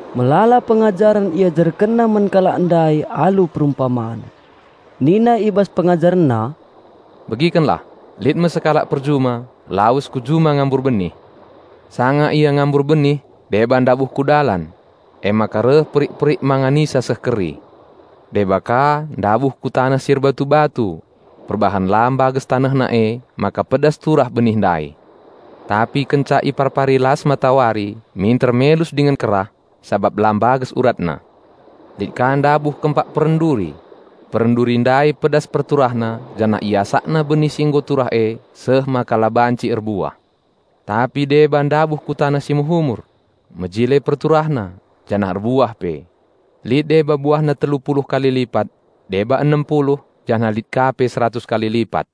Melala pengajaren IajarkenNa man alu perumpaman. Nina i bas PengajarenNa, "Begikenlah! Lit me sekalak perjuma, lawes ku juma ngambur benih. Sanga ia ngambur benih deba ndabuh ku dalan. Emaka reh perik-perik manganisa seh keri. Deba ka ndabuh ku taneh si erbatu-batu. Perbahan la mbages tanehna emaka pedas turah benih ndai. Tapi kenca iparpari las matawari minter melus dingen kerah, sabap la mbages uratna. Lit ka ndabuh kempak peren duri. Peren duri ndai pedas perturahna janah iasakna benih si nggo turah e seh maka la banci erbuah. Tapi deba ndabuh ku taneh si mehumur. Mejile perturahna, janah erbuah pe. Lit deba buahna telu puluh kali lipat, deba enem puluh, janah lit ka pe seratus kali lipat."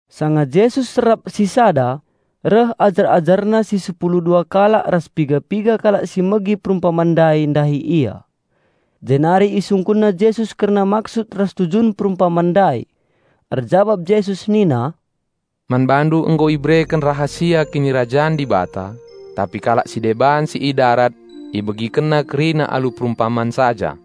Sanga Jesus serap sisada, reh ajar-AjarNa si sepulu dua kalak ras piga-piga kalak si megi perumpaman ndai ndahi Ia. Jenari isungkunna Jesus kerna maksud ras tujun perumpaman ndai. Erjabap Jesus nina, "Man bandu nggo ibereken rahasia Kinirajan Dibata. Tapi kalak si deban si i darat, ibegikenna kerina alu perumpaman saja,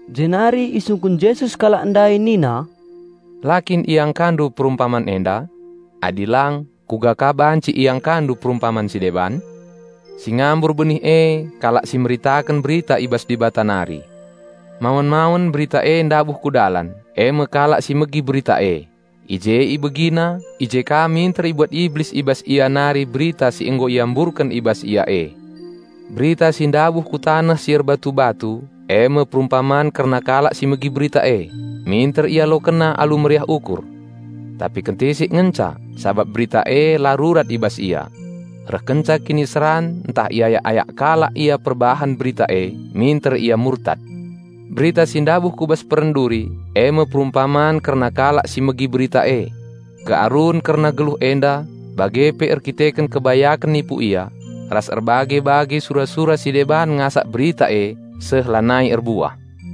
Jenari isungkun Jesus kalak ndai nina, "La kin iangkandu perumpaman enda? Adi lang kuga ka banci iangkandu perumpaman si deban? Si ngambur benih e kalak si meritaken berita i bas Dibata nari. Mawen-mawen berita e ndabuh ku dalan e me kalak si megi berita e, i je ibegina, i je ka minter ibuat Iblis i bas ia nari Berita si nggo iamburken i bas ia e. Berita si ndabuh ku taneh si erbatu-batu e me perumpaman kerna kalak si megi berita e, minter ialokenna alu meriah ukur. Tapi kentisik ngenca, sabap berita e la rurat i bas ia. Reh kenca kiniseran ntah iayak-ayak kalak ia perbahan Berita e, minter ia murtad. Berita si ndabuh ku bas peren duri e me perumpaman kerna kalak si megi Berita e, kearun kerna geluh enda, bage pe erkiteken kebayaken nipu ia, ras erbage-bage sura-sura si deban ngasak Berita e seh lanai erbuah.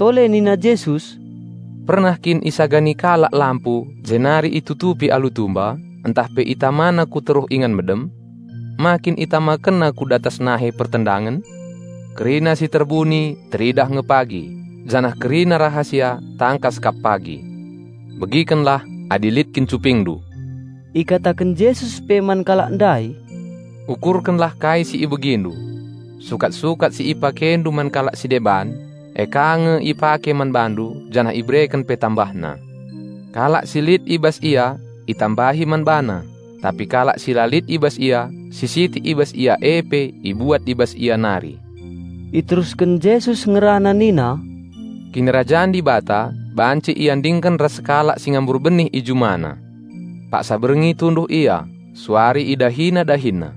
Tole nina Jesus, "Pernah kin isagani kalak lampu jenari itutupi alu tumba ntah pe itamana ku teruh ingan medem? Ma kin isangketkenna nge ku inganna sangket? Kerina si terbuni teridah nge pagi, janah kerina rahasia tangkas kap pagi. Begikenlah, adi lit kin cupingndu!" Ikataken Jesus pe man kalak ndai, "Ukurkenlah kai si ibegindu! Sukat-sukat si ipakendu man kalak si deban, e ka nge ipake man bandu, janah ibereken pe tambahna. Kalak si lit i bas ia itambahi man bana, tapi kalak si la lit i bas ia, si sitik i bas ia e pe ibuat i bas ia nari." Iterusken Jesus ngerana nina, "Kinirajan Dibata banci iandingken ras sekalak si ngambur benih i jumana. Paksa berngi tunduh ia; suari idahina dahinna.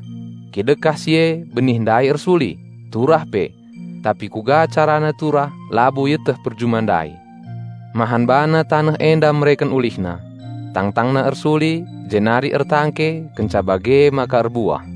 Kidekah si e benih ndai ersuli, turah pe. Tapi kuga carana turah labo ieteh perjuma ndai. Mahan bana taneh enda mereken asilna. Tangtangna ersuli, jenari ertangke, kenca bage maka erbuah.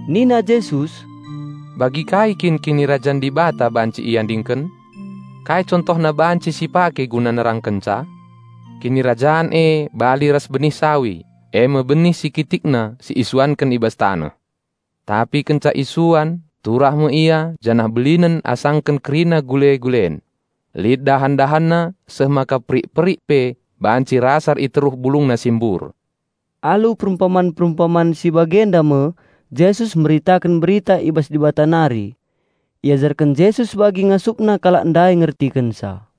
Nina Jesus, "Bagi kai kin Kinirajan Dibata banci iandingken? Kai contohna banci si pake guna nerangkenca? Kinirajan e bali ras benih sawi, e me benih si kitikna si isuanken i bas taneh. Tapi kenca isuan turah me ia janah belinen asaken kerina gule-gulen. Lit dahan-dahanna seh maka perik-perik pe banci rasar i teruh bulungna si mbur." Alu perumpaman-perumpaman si bagenda me Jesus meritaken Berita i bas Dibata nari. Iajarken Jesus bagi ngasupna kalak ndai ngertikenca.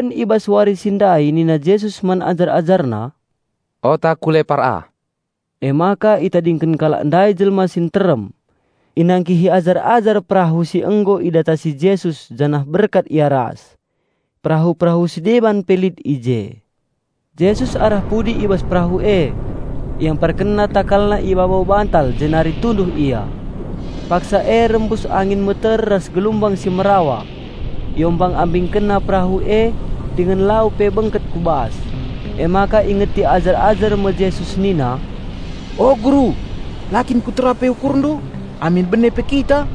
Karaben i bas wari si ndai nina Jesus man ajar-AjarNa, "Ota ku lepar ah." Emaka itadingken kalak ndai jelma si nterem. Inangkihi ajar-ajar perahu si nggo idatasi Jesus janah berkat ia ras. Perahu-perahu si deban pe lit i je. Jesus arah pudi i bas perahu e, IamparkenNa TakalNa i babo bantal jenari tunduh Ia. Paksa e rembus angin meter ras galumbang si merawa. Iombang-ambingkenna perahu e, dingen lau pe bengket ku bas. Emaka ingeti ajar-ajar me Jesus nina, "O Guru, la kin kutera pe ukurndu amin bene pe kita?"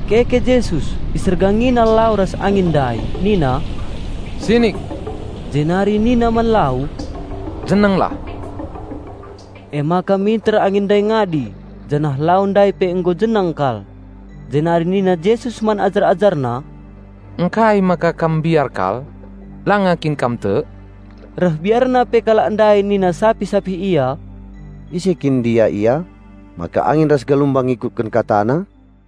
Keke Jesus, IsergangiNa lau ras angin ndai nina, "Sinik!" Jenari nina man lau, "Jenenglah!" Emaka minter angin ndai ngadi, janah lau ndai pe nggo jeneng kal. Jenari nina Jesus man ajar-AjarNa, "Ngkai maka kam mbiar kal? Langa kin kam tek?" Reh biarna pe kalak ndai nina sapih-sapih ia, "Ise kin ndia Ia, maka angin ras galumbang ngikutken KataNa?"